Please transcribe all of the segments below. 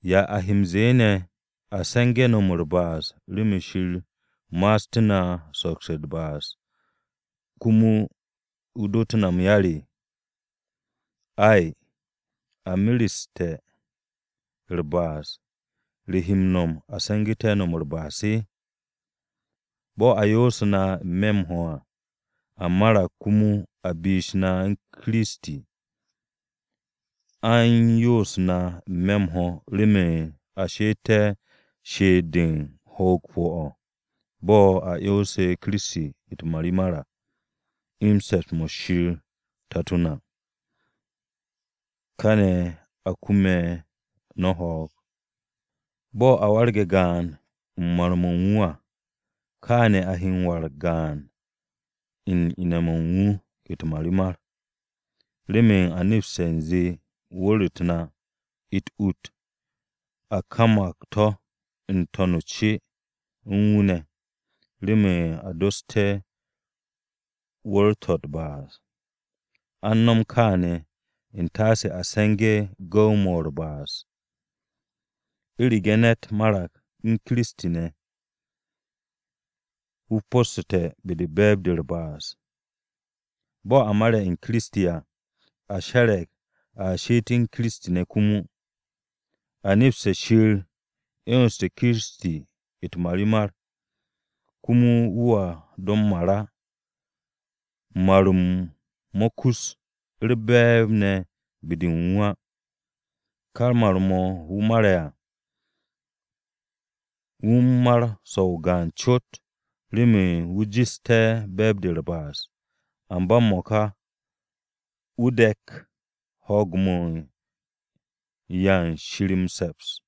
¿Ya a he m-ze̱e̱ ne̱? ¿A se̱nge̱ no̱m u̱r-ba'as remen Shir ma'astú̱ na u̱n sokse̱ u̱r-ba'as komo wu̱ dootú̱ na m-yar? Ay! A mereste̱ u̱r-ba'as, ¿re he m-no̱m a se̱ngu̱te̱ no̱m u̱r-ba'as? Bo̱ a yo'ose̱ na n-me̱ m-ho̱ à, a marag komo a bish na u̱n Kiristi. A u̱n yo'os na n-me̱ m-ho̱ remen a she'etté̱ she'et-de u̱n ho̱o̱g pu̱-o̱, bo̱ a 'yonse̱ Ye̱so u̱t-marimar à, u̱n se̱ps-mo̱ Shir Tato na. Kaane̱ a kume̱ no̱ ho̱o̱g. Bo̱ a warge̱ gaan u̱n mar-mo̱ u̱n wu̱ à, kaane̱ a he m-warag gaan u̱n wu̱ ne̱ u̱n ine̱-mo̱ u̱n wu̱ u̱t-marimar. Remen a nepste̱ u̱nze wu̱r-u̱t na, u̱t-ut a kamag to̱ n-to̱n o-ce u̱n wu̱ ne̱, remen a dossté̱ wu̱r-to̱ u̱r-ba'as. A u̱n no̱m kaane̱, u̱ntaase a se̱ngé̱ gu̱w-mo̱ u̱r-ba'as. U̱rege̱ ne̱t marag u̱n Kiristi ne̱, wu̱ po̱ssu̱te̱ be-de u̱n be̱e̱b-de u̱r-ba'as. Bo̱ a mare̱ u̱n Ye̱so Kiristi à, a she̱re̱g a she'et u̱n Kiristi ne̱ komo. A nepste̱ Shir 'yonste̱ Kiristi u̱t-marimar, komo wu̱a do m-mar á. Mar-m mo̱ kus u̱r-be̱e̱b ne̱ be-de u̱n wu̱ á. Ka mar-mo̱ wu̱ mare̱ à, wu̱ u̱n mar so-o gaan cot remen wu̱ jeste̱ be̱e̱b-de u̱r-ba'as. Amba m-mo̱ka wu̱ de̱k ho̱o̱g-mo̱ u̱n 'ya u̱n Shir m-se̱ps.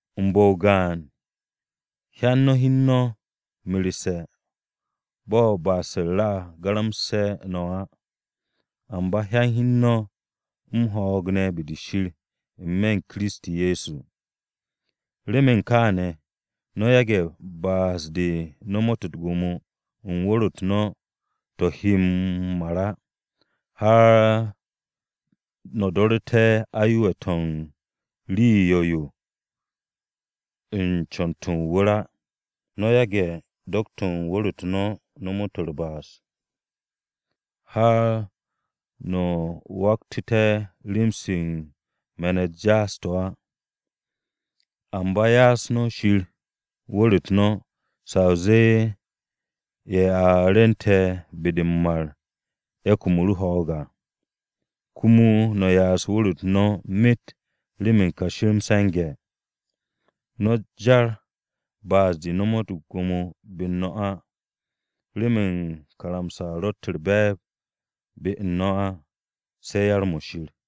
U̱n bu̱-o gaan, hyan no̱ hi u̱n no̱ merse̱ bo̱ ba'as-u̱r a garamse̱ no̱ á, amba hyan no̱ hi u̱n no̱ m-ho̱o̱g ne̱ be-de Shir n-me̱ u̱n Kiristi Ye̱so. Remen kaane̱, no̱ yage̱ ba'as-de nomot u̱t-gwo̱mo u̱n wu̱r-u̱t no̱ to̱ he m-mar á, har no̱ do̱ru̱te̱ aye̱we̱-to̱ u̱n rii 'yo̱-yo u̱n co̱n-to̱ o-wu̱r á. No̱ yage̱ do̱k-to̱ u̱n wu̱r-u̱t no̱ nomot u̱r-ba'as, har to̱ waktu̱te̱ rem-se me̱n-u̱t jaas-to̱ á. Amba ya'as no̱ Shir wu̱r-u̱t no̱, sa o zee ye̱ a rwu̱nte̱ be-de m-mar ye̱ kumu̱ru̱ ho̱o̱g à, komo no̱ ya'as wu̱r-u̱t no̱ myet remen kashi m-se̱nge̱. No̱ jar ba'as-de no̱m u̱t-gwo̱mo be-u̱r no̱ á, remen karamsa-o ro̱tt u̱r-be̱e̱b be-u̱r no̱ á, se̱ yar-mo̱ Shir.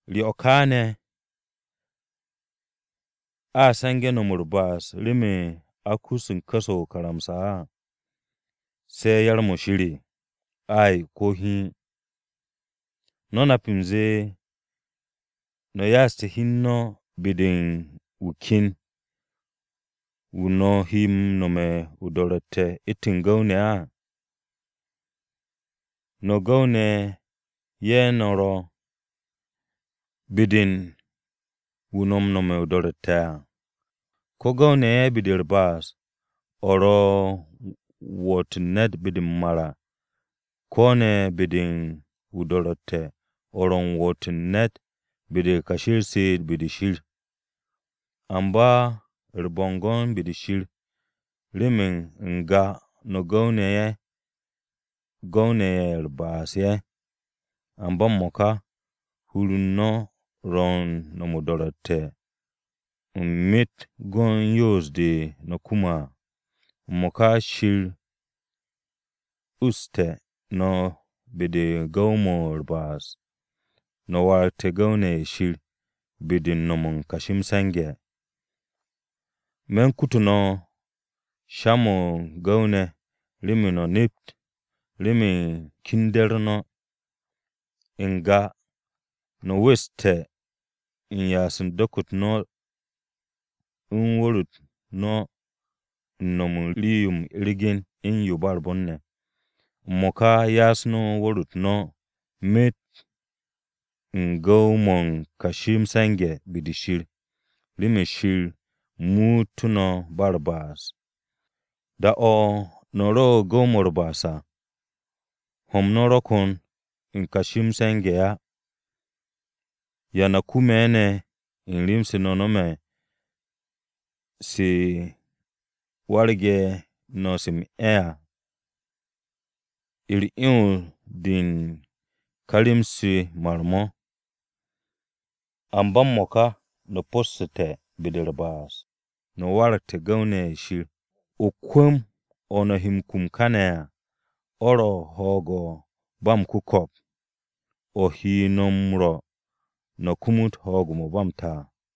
¿Re o̱ ka ne̱? ¿A se̱nge̱ no̱m u̱r-ba'as remen a u̱n ku̱s-o̱ o-karamsa á, se̱ yar-mo̱ Shir? Ay! Ko̱ hiin! ¿No̱ nap u̱nze no̱ ya'aste̱ hi u̱n no̱ be-de u̱n wu̱ ken, wu̱ no̱ he m-no̱me̱ o-do̱ro̱tte̱ u̱ntu̱n gu̱w-ne̱? No̱ gu̱w-ne̱ ye̱ no̱ ro̱ be-de u̱n wu̱ no̱ m-no̱me̱ o-do̱ro̱tte̱ à. No̱ gu̱w-ne̱ ye̱ be-de u̱r-ba'as, de ro̱ m-woot u̱n ne̱t be-de m-mar à, ko̱ ne̱ be-de o-do̱ro̱tte̱ o̱ ro̱ m-woot u̱n ne̱t be-de u̱n kashi u̱r-she'et be-de Shir. Amba u̱r-bo̱ngo̱n be-de Shir, remen n-ga no̱ gu̱w-ne̱ ye̱ u̱r-ba'as ye̱, amba m-mo̱ka, hur u̱n no̱ ro̱ u̱n no̱m o-do̱ro̱tte̱ o̱ u̱n myet go̱n yoos-de no̱ kume̱ à. M-mo̱ka Shir uste̱ no̱ be-de gu̱w-mo̱ u̱r-ba'as, no̱ waragte̱ gu̱w-ne̱ ye̱ Shir be-de u̱n no̱m u̱n kashi m-se̱nge̱. Me̱ u̱n kutu̱ no̱ sha-mo̱ gu̱w-ne̱ remen no̱ nept, remen kende̱-u̱r no̱. N-ga no̱ weste̱ m-ya'as u̱n do̱k-to̱ u̱n wu̱r-u̱t no̱ u̱n no̱m u̱n rii-yo u̱n ergen u̱n yo ba u̱r-bon ne̱. M-mo̱ka ya'as no̱ wu̱r-u̱t no̱ myet u̱n gu̱w-mo̱ u̱n kashi m-se̱nge̱ be-de Shir, remen Shir muutú̱ no̱ ba u̱r-ba'as. Da-o̱ no̱ ro u̱n gu̱w-mo̱ u̱r-ba'as à, ho̱-m no̱ ro kon u̱n kashi m-se̱nge̱ á. ¿Ya no̱ kume̱ ne̱ u̱n rem-se no̱ no̱me̱ se warge̱ no̱ se m-'e̱ à? U̱r-'yons de u̱n ka rem-se mar-mo̱. Amba m-mo̱ka, no̱ po̱ssu̱te̱ be-de u̱r-ba'as, no̱ waragte̱ gu̱w-ne̱ ye̱ Shir. Kwu̱m-o̱ no̱ he m-kum kane̱ à o̱ ro̱ ho̱o̱g-mo̱ ba m-ku̱ko̱p, o̱ he no̱ m-rwo̱ no̱ kumut ho̱o̱g-mo̱ ba m-ta.